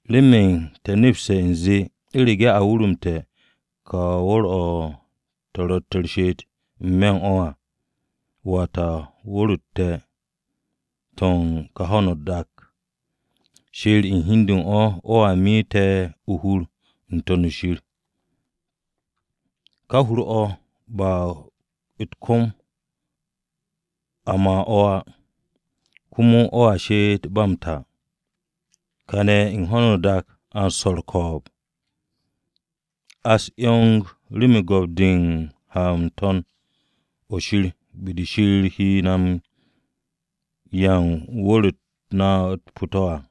Remen te̱ nepse̱ u̱nze u̱rege̱ a wurumte̱ ka hur-o̱ te̱ ro̱tte̱ u̱r-she'et n-me̱ u̱n o̱ à, (wata wu̱r-u̱t te̱, to̱ u̱n ka ho̱no o-dak o̱), Shir u̱n hi u̱n de u̱n o̱ o̱a me te̱ o-hur n-To̱n shir. Ka hur-o̱ ba u̱t-kom a ma o̱ á. Komo o̱a she'et ba m-ta. Kane̱ u̱n ho̱no o-dak a u̱n swo̱ u̱r-ko̱o̱b. A u̱s-'yong remen go̱p-de m-ha n-to̱n o̱ Shir be-de Shir he na 'ya u̱n wu̱r-u̱t na u̱t-pu̱ to̱ à.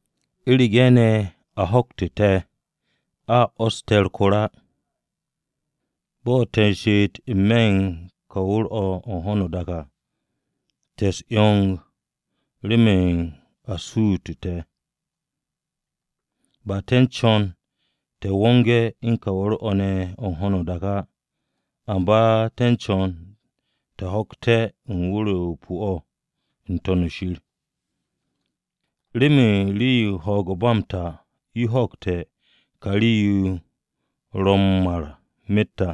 U̱rege̱ ne̱ a ho̱kte̱ te̱, a 'wo̱s te̱ u̱r-kor á. Bo̱ te̱ u̱r-she'et n-me̱ u̱n ka wu̱r-o̱ u̱n ho̱no o-dak o̱ à, te̱ u̱s-'yong remen a sutu te̱. Ba te̱ u̱n co̱n te̱ wonge̱ u̱n ka wu̱r-o te̱ o̱ ne̱ o̱ u̱n ho̱no o-dak á, amba te̱ u̱n co̱n te̱ ho̱kte̱ wu̱r-o pu̱-o̱ n-To̱n shir, remen rii-yo u̱n ho̱o̱g-o̱ ba m-ta yo ho̱kte̱ ka rii-yo yo ro̱ m-mar myet à.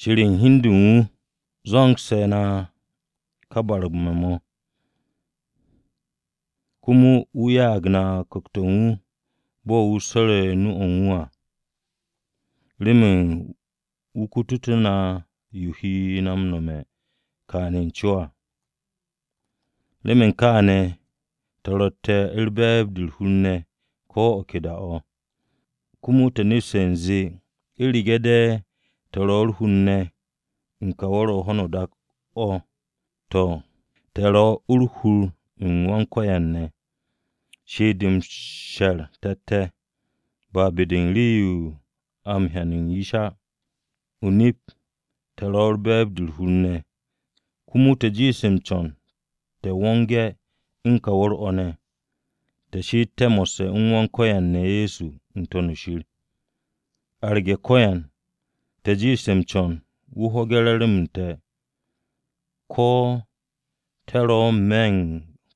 Shir u̱n hi u̱n de u̱n wu̱ zo̱ngse̱ na ka barme̱-mo̱, komo wu̱ ya'ag na Ku̱kt-o̱ u̱n wu̱ bo̱ wu̱ swo̱re̱ nu-o̱ u̱n wu̱ à remen wu̱ kututé̱ na yo wu̱ he na m-nome̱ kane̱ o-co à. Remen kaane̱ te̱ ro̱tte̱ u̱n be̱e̱b-de u̱r-hur ne̱ ko̱ o̱ ke da-o̱, komo te̱ nepse̱ u̱nze u̱rege̱ de̱ te̱ ro̱ o-hur ne̱ u̱n ka wu̱r-o̱ u̱n ho̱no o-dak o̱, to̱, te̱tt o-hur u̱n Wan-Ko̱yan ne̱ á. She'et-de m-she̱r te̱tte̱, ba be-de u̱n rii-yo a m-hyan u̱n yish á. O-nip, te̱ ro̱ u̱n be̱e̱b-de u̱r-hur ne̱, komo te̱ jiishte̱ m-co̱n te̱ wonge̱ u̱n o̱ ka wu̱r-o̱ ne̱, te̱ she'ete̱ mo̱sse̱ u̱n Wan-Ko̱yan ne̱ Ye̱so n-To̱n shir. Arge̱ ko̱yan, te̱ jiishte̱ m-co̱n wu̱ ho̱ge̱ re̱re̱m-m te̱, ko̱ te̱ ro̱ n-me̱ u̱n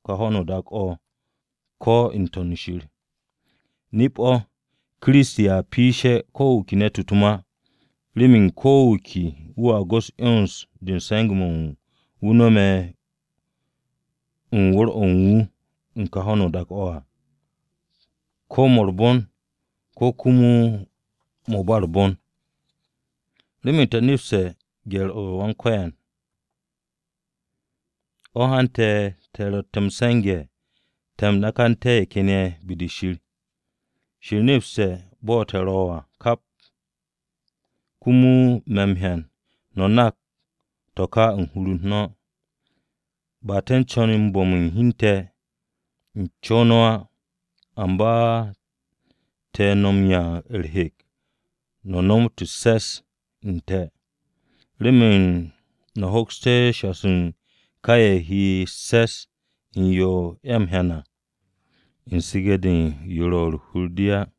ka ho̱no o-dak o̱ ko̱ n-To̱n shir. Nip-o̱, Kiristi a piishe̱ ko̱ wu̱ ke ne̱t-wu̱ u̱t-ma. Remen ko̱ wu̱ ke wu̱a go̱ks 'yons-de u̱n se̱nge̱-mo̱ wu̱ no̱me̱ u̱n wu̱r-o̱ u̱n wu̱ u̱n ka ho̱no o-dak o̱ à, ko̱ mo̱ u̱r-bon, ko̱ komo mo̱ u̱n ba u̱r-bon. Remen te̱ nepste̱ gye̱r-o Wan-Ko̱yan, o̱ hante̱ te̱ ro̱tte̱ m-se̱nge̱ te̱ nakante̱ ye̱ ken ye̱ be-de Shir. Shir nepse̱ bo̱ te̱ ro̱ à kap, komo me̱ m-hyan no̱ nak to̱ ka u̱n hur-u̱r no̱. Ba te̱ m-co̱n te̱ bu̱m hi u̱n te̱ u̱n co-o no̱ á, amba te̱ no̱ m-'ya u̱r-hek no̱ nomot u̱s-se̱s u̱n te̱, remen no̱ hoksté̱ shassu̱ u̱n ka ye̱ ro̱ u̱s-se̱s u̱n yo a m-hyan à u̱n su̱ge̱-de u̱n yo ro̱ u̱n hur-de u̱n ye̱ à.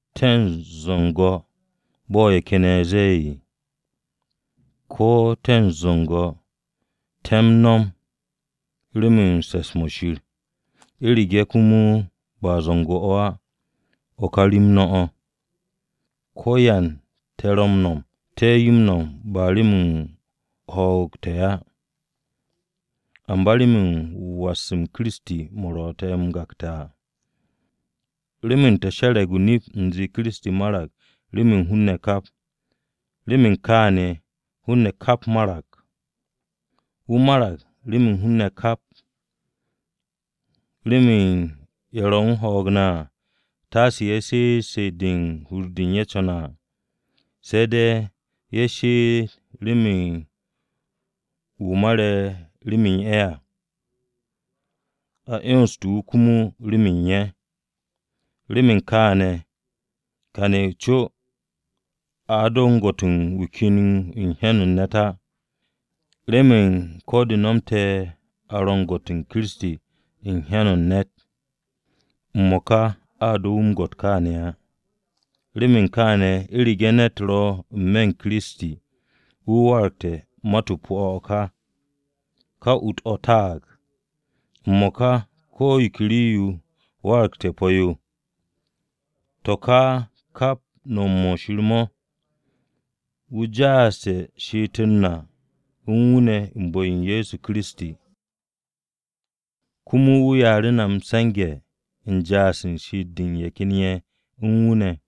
¿Te̱ u̱n zu̱nge̱, bo̱ ye̱ ken ye̱ ze̱e̱? Ko̱ te̱ zu̱nge̱, te̱ m-no̱m remen se̱ps-mo̱ Shir. U̱rege̱ komo ba zu̱ngo̱ á, o̱ ka rem no̱ o̱. Ko̱yan te̱ ro̱ m-no̱m, te̱ yo m-no̱m ba remen ho̱o̱g te̱ á, amba remen was-m Kiristi mo̱ ro̱ te̱, m-gakte̱ à. Remen te̱ she̱re̱g o-nip u̱nze Kiristi marag remen hun-ne̱ kap, remen kaane̱ hun-ne̱ kap marag. Wu̱ marag remen hun-ne̱ kap, remen ye̱ ro̱ u̱n ho̱o̱g ne̱ à, taase ye̱ she'et she'et-de u̱n yo hur-de u̱n ye̱ co̱ne̱ à. Se̱ de̱ ye̱ she'et remen wu̱ mare̱ rem u̱n ye̱ à, a 'yonste̱ wu̱ komo remen ye̱. Remen kaane̱, kane̱ u̱n co a do m-gwo̱t u̱n wu̱ ken u̱n hyan-o̱ u̱n ne̱t á, remen ko̱ de nomte̱ a ro u̱n gwo̱t-o Kiristi u̱n hyan-o̱ u̱n ne̱t, m-mo̱ka a do̱ wu̱ m-gwo̱t kaane̱ á. Remen kaane̱, u̱rege̱ ne̱t ro̱ n-me̱ u̱n Kiristi, wu̱ waragte̱ mat-o pu̱-o̱ o̱ ka, ka ut-o̱ taag, m-mo̱ka ko̱ yo ke rii-yo waragte̱ o-pu̱ yo. To̱ ka kap no̱m-mo̱ Shir mo̱, wu̱ ja'aste̱ she'et-u̱r na u̱n wu̱ ne̱ u̱n bu̱-o Ye̱so Kiristi. Komo wu̱ ya'u̱ru̱ na se̱nge̱-mo̱ u̱n ja'as u̱n she'et-de u̱n ye̱ ken ye̱ u̱n wu̱ ne̱.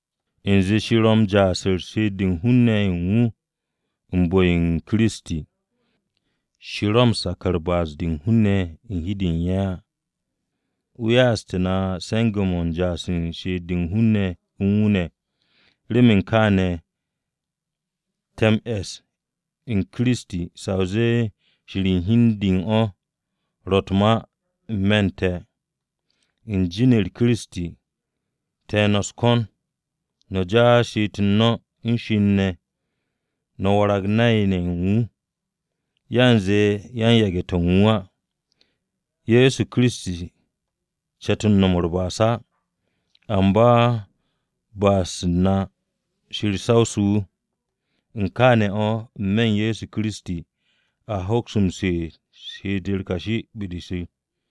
U̱nze Shir ro̱ m-ja'as u̱n she'et-de u̱n hun-ne̱ u̱n wu̱ ne̱ u̱n bu̱-o Kiristi, Shir ro̱ m-sak u̱n ba'as-de u̱n hun-ne̱ u̱n hi-de u̱n ye̱ á. Wu̱ ya'aste̱ na se̱nge̱-mo̱ u̱n ja'as u̱n she'et-de u̱n hun-ne̱ u̱n wu̱ ne̱. Remen kaane̱, te̱ m-esse̱ u̱n Kiristi sa o zee Shir u̱n hi u̱n de u̱n o̱ ro̱ u̱t-ma n-me̱ u̱n te̱. U̱n jin-u̱r Kiristi, te̱ no̱ u̱s-ko̱n no̱ ja'as she'et-u̱r no̱ u̱n Shir ne̱ no̱ warag nay-ne̱ ye̱ u̱n wu̱, yanze yan-yage̱-to̱ u̱n wu̱ á. Ye̱so Kiristi ce̱t no̱m u̱r-ba'as á! Amba ba'as-u̱t na Shir sawse̱ wu̱. U̱n kaane̱ o̱, n-me̱ u̱n Ye̱so Kiristi, a hoks she'et u̱n she'et-u̱r kashi be-de Shir.